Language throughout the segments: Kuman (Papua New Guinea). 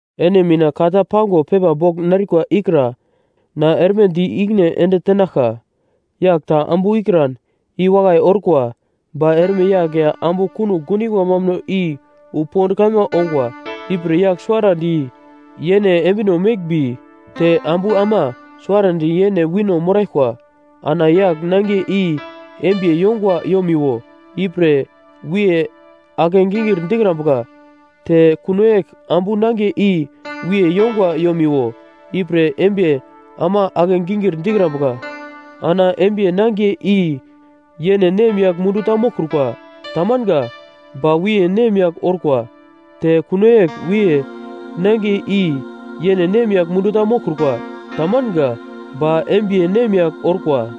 Ene mina ka ta pango pepa bogl narikwa ikra na erme di ikine ende tenaglka. Yagl ta ambu ikran i wakai orkwa. Ba erme yagl ya ambu kunogl gundingwa mambuno i wu pond kaima ongwa, ipre yagl suwarandi yene embino meglmbi te ambu ama suwarandi yene wino moraglkwa. Ana yagl nangiye i embiye yongwa yomiwo, ipre wiye ake-gingir dikrambuka. Te kuno yegl ambu nangiye i wiye yongwa yomiwo, ipre embiye ama ake-gingir dikrambuka. Ana embiye nangiye i yene nemyagl mundu ta moglkrukwa. Tamanga. Ba wiye nemyagl orkwa. Te kuno yegl wiye nangiye i yene nemyagl mundu ta moglkrukwa. Tamanga. Ba embiye nemyagl orkwa.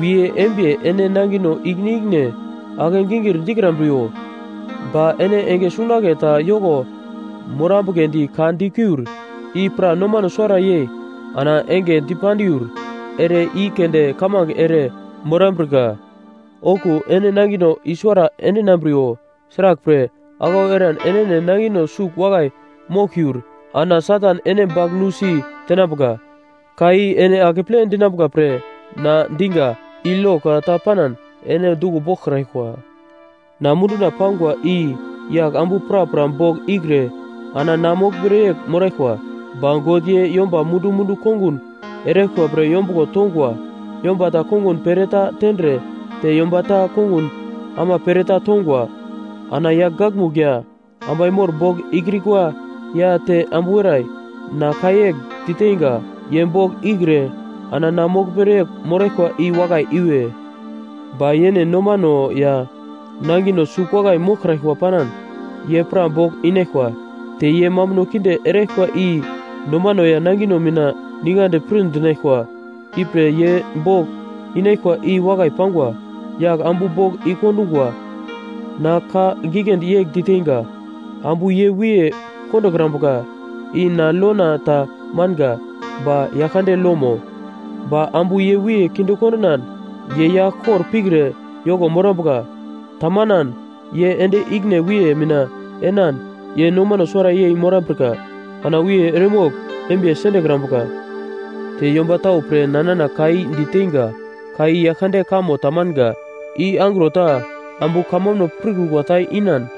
Wiye embiye ene nangino ikine ikine ake-gingir dikrambriwo. Ba ene enge sungunagle ta yoko morambugledi ka dikiur, i pra nomano suwara yei ana enge dipandiur ere i keunde kamange ere morambrika. Okuwo ene nangino i-suwara endinambriwo. Sraglpre, aglau eran enene nangino sugl wakai moglkiur ana Satan ene bagl nusi tenambuka. Ka i ene akeple dinambuka pre na diga, i lo ka ta panan ene duglo boglkraglkwa. Na munduna pangwa i yagl ambu prapra bogl ikre ana na moglmere yegl moraglkwa, ba God ye yomba mundu-mundu kongun eraglkwa pre yombuglo tongwa. Yomba ta kongun pereta tendre, te yomba ta kongun ama pereta tongwa. Ana yagl gakmugl ya ambai mor bogl ikrikwa ya te ambu werai, na ka yegl diteinga: Ye bogl ikre ana na moglmere yegl moraglkwa i wakai iwe. Ba yene nomano ya nangino sugl wakai moglkraglkwa panan, ye pra bogl inaglkwa. Te ye mambuno kinde eraglkwa i nomano ya nangino mina ningadi pir dinaglkwa, ipre ye bogl inaglkwa i wakai pangwa. Yagl ambu bogl i-kondungwa na ka giglendi yegl diteinga, “Ambu ye wiye kondokrambuka.” I na lona ta manga ba Yaglkande lomo. Ba ambu ye wiye kinde kondinan, ye yagl kor pikre yoko morambuka. Tamanan, ye ende ikine wiye mina enan ye nomano suwara yei morambrika. Ana wiye eremogl embiye sendekrambuka. Te yomba tau pre na nana ka i diteinga, ka i Yaglkande kamo tamanga. I angro ta ambu kamambuno pirkrukwa ta inan,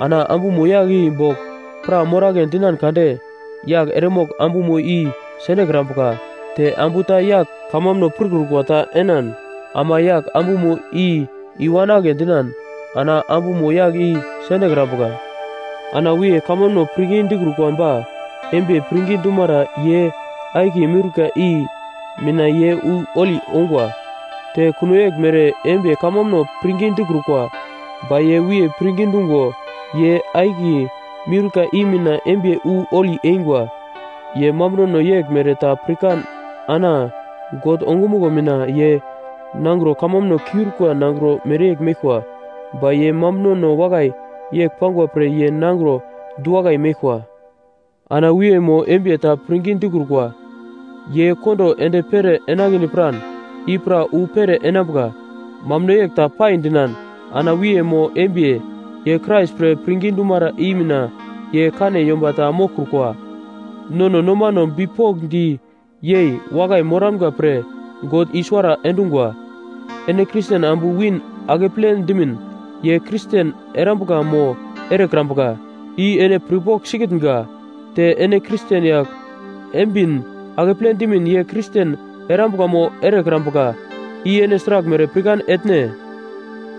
ana ambumo yagl i bogl pra moragle dinan kade, yagl eremogl ambumo i sendekrambuka. Te ambu ta yagl kamambuno pirkrukwa ta enan ama yagl ambumo i i-wanagle dinan, ana ambumo yagl i sendekrambuka. Ana wiye kamambuno pirngi dikrukwa ba embiye pirngi dumara ye akiye miurka i mina ye wu holi ongwa. Te kuno yeglmere embiye kamambuno pirngi dikrukwa, ba ye wiye pirngi dungo ye akiye miurka i mina embiye wu holi eingwa. Ye mambunono yeglmere ta paikran ana God ongumuglo mina ye nangro kamambuno kiurikwa nangro mereyegl meglkwa. Ba ye mambunono wakai yegl pangwa pre ye nangro du-wakai meglkwa. Ana wiye mo embiye ta pirngi dikrukwa ye kondo ende pere enagledi piran, i pra wu pere enambuka. Mambuno yegl ta pai dinan ana wiye mo embiye, ye Krais pre pirngi dumara i mina ye kane yomba ta moglkrukwa. Nono nomano bipokndi yei wakai moramga pre God i-suwara endungwa. Ene Kristen ambu win akeple dimin ye Kristen erambuka mo erekrambuka, i ene pirpogl sikitnga? Te ene Kristen yagl embin akeple dimin ye Kristen erambuka mo erekrambuka, i ene sraglmere pirkan etne?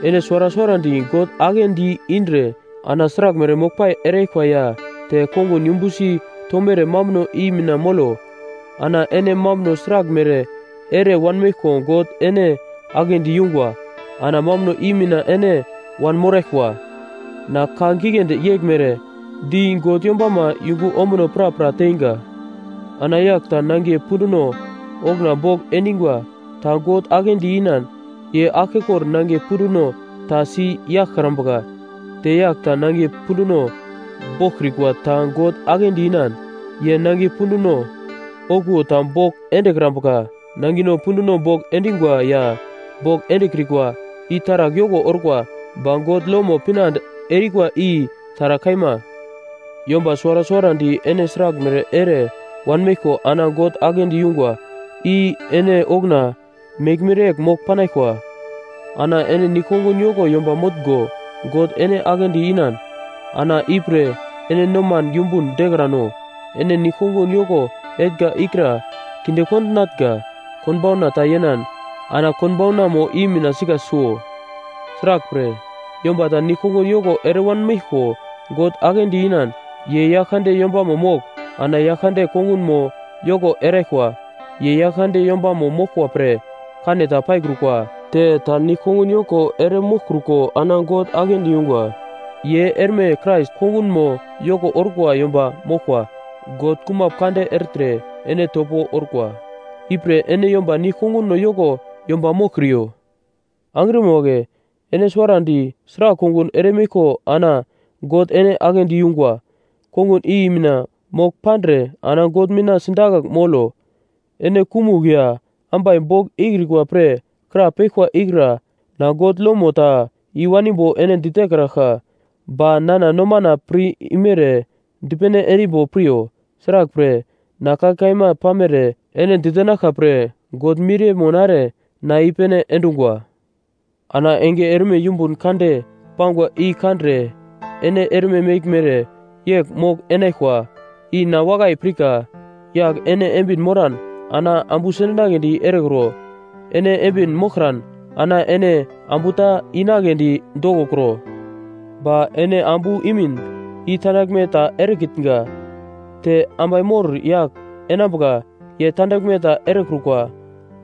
Ene suwara suwarandi God aglendi indre ana sraglmere moglpai eraglkwa ya te kongun yumbusi tomere mambuno i mina molo. Ana ene mambuno sragl mere ere wanmeglko God ene aglendi yungwa, ana mambuno i mina ene wanmoraglkwa. Na ka giglendi yeglmere di God yombama yungu ombuno prapra teinga. Ana yagl ta nangiye punduno okuna bogl endingwa ta God aglendi inan. Ye aglkekor nangiye punduno ta si yaglkrambuka. Te yagl ta nangiye punduno boglkrikwa ta God aglendi inan. Ye nangiye punduno okuwo ta bogl endekrambuka. Nangino punduno bogl endingwa ya bogl endekrikwa i taragl yoko orkwa. Ba God lomo pinande erikwa i taragl kaima. Yomba suwara suwarandi ene sraglmere ere wanmeglko ana God aglendi yungwa, i ene okuna meglmere yegl mogl panaglkwa. Ana ene nigl-kongun yoko yomba motngo, God ene aglendi inan, ana ipre ene noman yumbun dekrano. Ene nigl-kongun yoko etnga ikra kinde kondinatnga konbauna ta yenan ana konbaunano i mina sika suo. Sraglpre, yomba ta nigl-kongun yoko ere wanmeglko God aglendi inan; ye Yaglkande yombamo mogl ana Yaglkande kongunmo yoko eraglkwa. Ye Yaglkande yombamo moglkwa pre kane ta paikrukwa. Te ta nigl-kongun yoko ere moglkruko ana God aglendi yungwa ye erme Krais kongunmo yoko orkwa yomba moglkwa. God kumap kande ertre ene topo orkwa. Ipre ene yomba nigl-konguno yoko yomba moglkriyo. Angrima wagle, ene suwarandi sragl kongun eremeglko ana God ene aglendi yungwa, kongun i mina mogl pandre ana God mina sidakagl molo. Ene kumugl ya ambai bogl ikrikwa pre krapeglkwa ikra na God lomo ta i-wanimbo ene ditekraglka, ba nana nomana pir imere dipene endimbo piryo. Sraglpre, na ka kaima pamere ene ditenaglka pre God miriyemo nare na i-pene endungwa. Ana enge erme yumbun kande pangwa i kandre ene erme meglmere yegl mogl-enaglkwa, i na wakai pirka. Yagl ene embin moran, ana ambu sendinagledi erekro. Ene embin moglkran, ana ene ambu ta inagledi dokokro. Ba ene ambu imin i tandaglme ta erekitnga. Te ambai mor yagl enambuka ye tandaglme ta erekrukwa.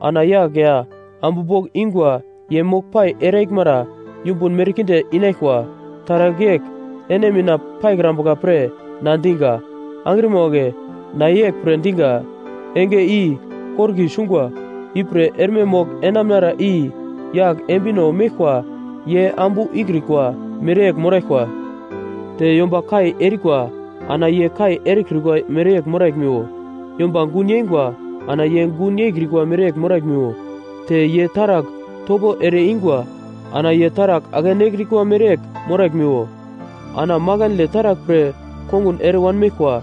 Ana yagl ya ambu bogl ingwa ye moglpai eraglmara yumbun merkinde inaglkwa. Taragl yegl ene mina paikrambuka pre na diga. Angrima wagle, na yeglpre diga: Enge i korki sungwa. Ipre erme mogl-enamnara i yagl embino meglkwa ye ambu ikrikwa mereyegl moraglkwa. Te yomba kai erikwa ana ye kai erekrikwa mereyegl moraglmiwo. Yomba gun yeingwa ana ye gun yeikrikwa mereyegl moraglmiwo. Te ye taragl topo ere ingwa ana ye taragl ake-nekrikwa mereyegl moraglmiwo. Ana makandle taragl pre kongun ere wanmeglkwa,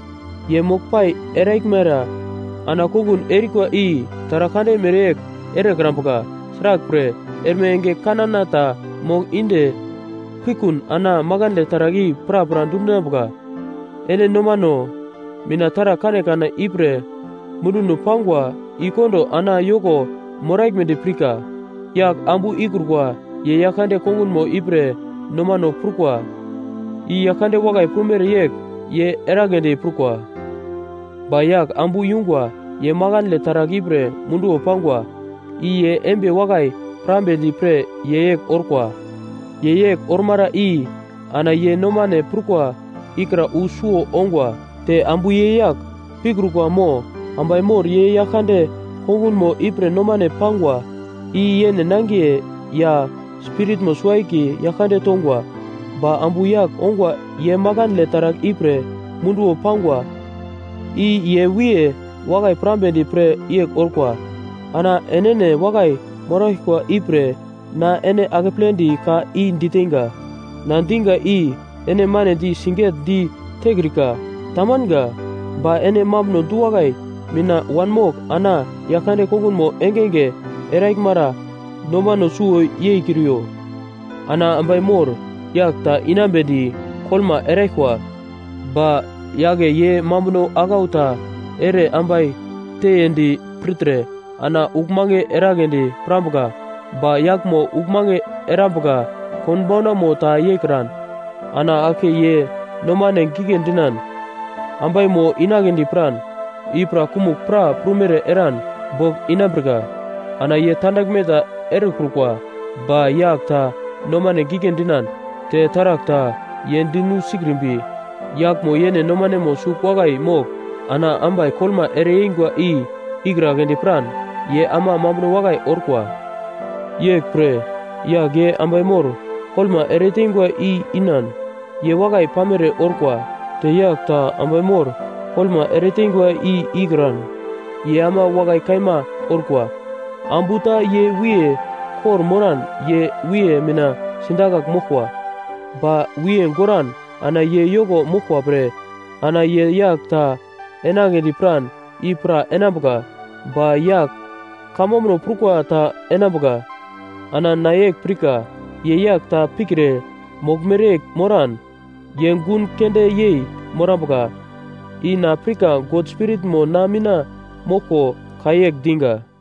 ye moglpai eraglmara ana kongun erikwa i taragl kande mereyegl erekrambuka. Sraglpre, erme enge kanana ta mogl inde pukun ana makandle taragl i prapra dundinambuka. Ene nomano mina taragl kanekane ipre munduno pangwa i kondo ana yoko moraglmedi pirka. Yagl ambu ikrukwa ye Yaglkande kongunmo ipre nomano prukwa, i Yaglkande wakai prumere yegl ye eragledi prukwa. Ba yagl ambu yungwa ye makandle taragl ipre munduwo pangwa, i ye embiye wakai pirambedi pre ye yegl orkwa. Ye yegl ormara i ana ye nomane prukwa ikra wu suwo ongwa. Te ambu ye yagl pikrukwa mo ambai mor ye Yaglkande kongunmo ipre nomane pangwa, i yene nangiye ya spiritmo suwo-akiye Yaglkande tongwa. Ba ambu yagl ongwa ye makandle taragl ipre munduwo pangwa, i ye wiye wakai pirambedi pre yegl orkwa. Ana enene wakai moraglkwa ipre na ene akepledi ka i diteinga. Na diga i ene manedi sigetdi tekrika. Tamanga. Ba ene mambuno du-wakai mina wanmogl ana Yaglkande kongunmo engenge eraglmara nomano suwo yeikriyo. Ana ambai mor yagl ta inambedi koglma eraglkwa, ba yagle ye mambuno aglau ta ere ambai teiyendi pirtre ana uglmange eragledi pirambuka. Ba yaglmo uglmange erambuka konbaunamo ta yeikran ana aglke ye nomane gigle dinan ambaimo inagledi piran, i pra kumugl pra prumere eran bogl inambrika. Ana ye tandaglme ta erekrukwa. Ba yagl ta nomane gigle dinan, te taragl ta ye dinu sikrimbi, yaglmo yene nomanemo sugl wakai mogl ana ambai koglma ereyeingwa i ikragledi piran ye ama mambuno wakai orkwa. Yeglpre yagl ye ambai mor koglma ereteingwa i inan, ye wakai pamere orkwa. Te yagl ta ambai mor koglma ereteingwa i ikran, ye ama wakai kaima orkwa. Ambu ta ye wiye kor-moran ye wiye mina sidakagl moglkwa. Ba wiye goran ana ye yoko moglkwa pre ana ye yagl ta enagledi piran i pra enambuka, ba yagl kamambuno prukwa ta enambuka. Ana na yegl pirka: Ye yagl ta pikre moglmere yegl moran, ye gun keunde yei morambuka. I na pirka God Spiritmo na mina moglko ka yegl diga.